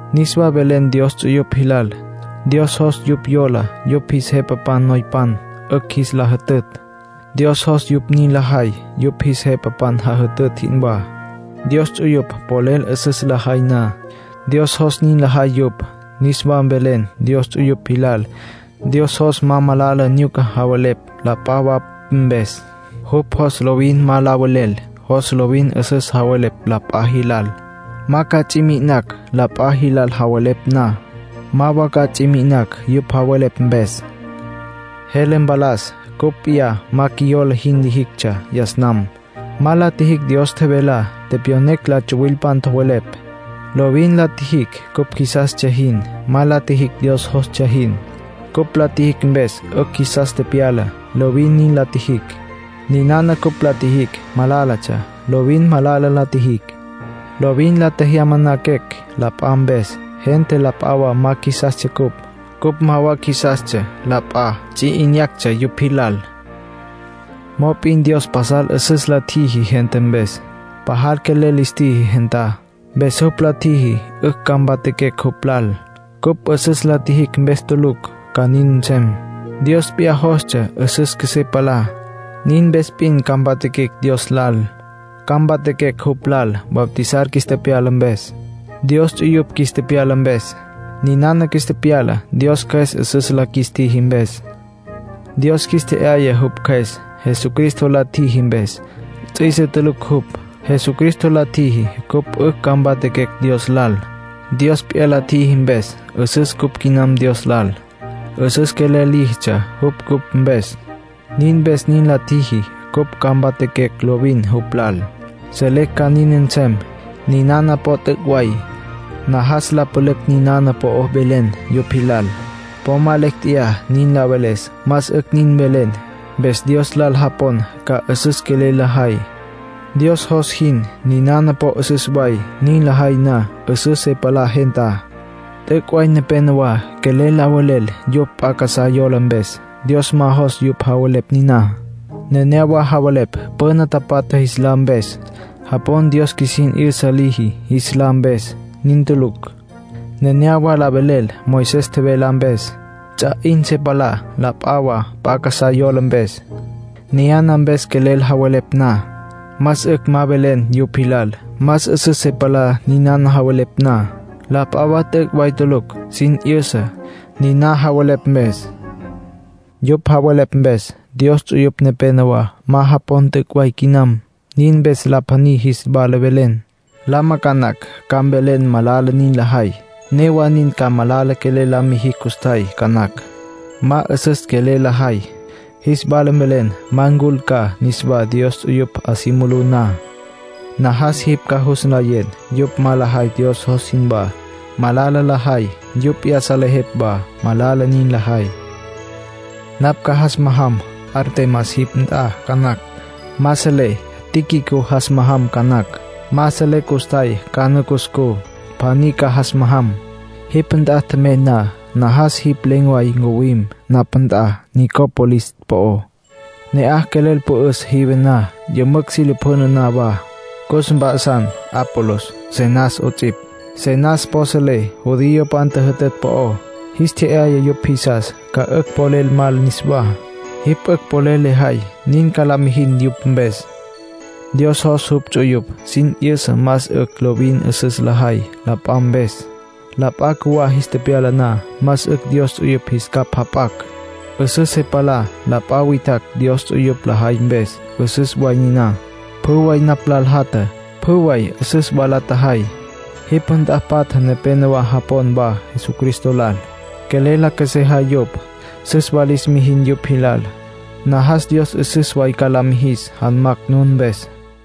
Niswa mvelen Dios ts'uyupj jilal, Dios jos yupj yola yupj jis jepapan noypan, 'ücj jis la jütütj. Dios jos yupj nin lajay yupj jis jepapan jajütütj jinwá. Dios ts'uyupj polel 'üsüs lajay na, Dios jos nin lajay yupj. Niswa mvelen Dios ts'uyupj jilal, Dios jos ma malala nyuca javelepj la p'a wa mpes. Jupj jos lovin ma la velel. Jos lovin 'üsüs javelepj la p'a jilal, ma ca ts'i mi'inacj. La p'a jilal javelepj na, ma wa ca ts'i mi'inacj yupj javelepj mpes. Jele mpalas cupj p'iyá ma qjuiyola jin lijictsja yas nam. Ma la tjijicj Dios tjevelá. Tepyonecj la tsuwilpan tjowelepj. Lovin la tjijicj cupj qjuisastsja jin. Ma la tjijicj Dios jostsja jin. Cupj la tjijicj mpes 'ücj qjuisas tepyala; lovin nin la tjijicj. Ninana cupj la tjijicj malálatsja. Lovin malala la tjijicj. Lovin la tjejyamaquecj la p'a mpes. Gente la p'a wa ma jisastsja ncupj. Cupj ma wa qjuisastsja la p'a, ts'i 'inyactsja yupj jilal. Mop'in Dios pasal 'üsüs la tjiji gente mpes. Pajal quelel lis tjiji gentá. Mpes jupj la tjiji 'ücj ca mpatjaquecj jupj lal. Cupj 'üsüs la tjijicj mpes tulucj ca nin nsem. Dios p'iyá jostsja 'üsüs qjuesé palá, nin mpes p'in ca mpatjaquecj Dios lal. Ca mpatjaquecj jupj lal bautizar qjuis tepyala mpes, Dios ts'uyupj qjuis tepyala mpes. Niná qjuis tepyala Dios Cjües 'üsüs la qjuis tjiji mpes. Dios qjuis tje'yaya jupj Cjües, Jesucristo la tjiji mpes. Ts'üise tulucj jupj. Jesucristo la tjiji cupj 'ücj ca mpatjaquecj Dios lal. Dios p'iyá la tjiji mpes, 'üsüs cupj quinam Dios lal. 'Üsüs quelel líjitsja jupj cupj mpes. Nin mpes nin la tjiji cupj ca mpatjaquecj lovin jupj lal. Selecj ca nin nsem. Ninana po t'üc' way. Najas la pülücj ninana po'o mvelen yupj jilal. Po ma lecj tjeyá nin la veles. Más 'ücj nin mvelen, mpes Dios lal japon ca 'üsüs quelel lajay, Dios jos jin. Ninana po 'üsüs way. Nin lajay na, 'üsüs se palá gentá. T'üc' way nepénowa quelel la velel yupj p'a casá yola mpes. Dios ma jos yupj javelepj niná. Nenéyawa javelepj püna tapatja jis lá mpes. Japon Dios qjuisin 'yüsa liji jis lá mpes. Nin tulucj. Nenéyawa la velel Moisés tjevelá mpes. Ts'a 'in se palá la p'a wa p'a casá yola mpes. Niyana mpes quelel javelepj na, más 'ücj ma mvelen yupj jilal. Ma 'üsüs se palá niná javelepj na. La p'a wa t'üc' way tulucj sin 'yüsa, niná javelepj mpes. Yupj javelepj mpes, Dios ts'uyupj nepénowa ma japon t'üc' way quinam. Nin mpes la pjaní jis wala mvelen, lama ca nacj, ca mvelen malala nin lajay. Newa nin ca malala quelel la mijicj custjay ca nacj; ma 'üsüs quelel lajay, jis wala mvelen ma ncul ca niswá Dios ts'uyupj 'a si mulú na. Najas jipj ca jus nlayen yupj ma lajay Dios jos jinwá. Malala lajay. Yupj p'iyá salejepj wa malala nin lajay. Napj ca jas majam Artemas jipj nt'a ca nacj. Ma selé. Tíquico jas majam ca nacj. Ma selé custjay cana cuscú. Pjaní ca jas majam. Jipj nt'a tjemey na, najas jipj len̈ way ncuwim napj nt'a Nicópolis po'ó. Ne'aj quelel pü'üs jive na, yümücj si lapjüna na wa. Cus mp'a'san Apolos, Zenas 'ots'ipj. Zenas po selé judiopan tjüjütütj po'ó. Jis tje'yaya yupj jisas, ca 'ücj polel mal niswá. Jipj 'ücj polel lejay, nin ca la mijin yupj mpes. Dios jos jupj ts'uyupj sin 'yüsa más 'ücj lovin 'üsüs lajay la p'a mpes. La p'a cjuwá jis tepyala na, más 'ücj Dios ts'uyupj jis capj jap'acj. 'Üsüs se palá la p'a witjacj Dios ts'uyupj lajay mpes, 'üsüs way niná. Pjü way napj lal jatja, pjü way süs wa la tjajay. Jipj nt'a patja nepénowa japon wa Jesucristo lal, quelel la qjuesejay yupj. Süs wa lis mijin yupj jilal. Najas Dios 'üsüs way ca la mijis janmacj nun mpes.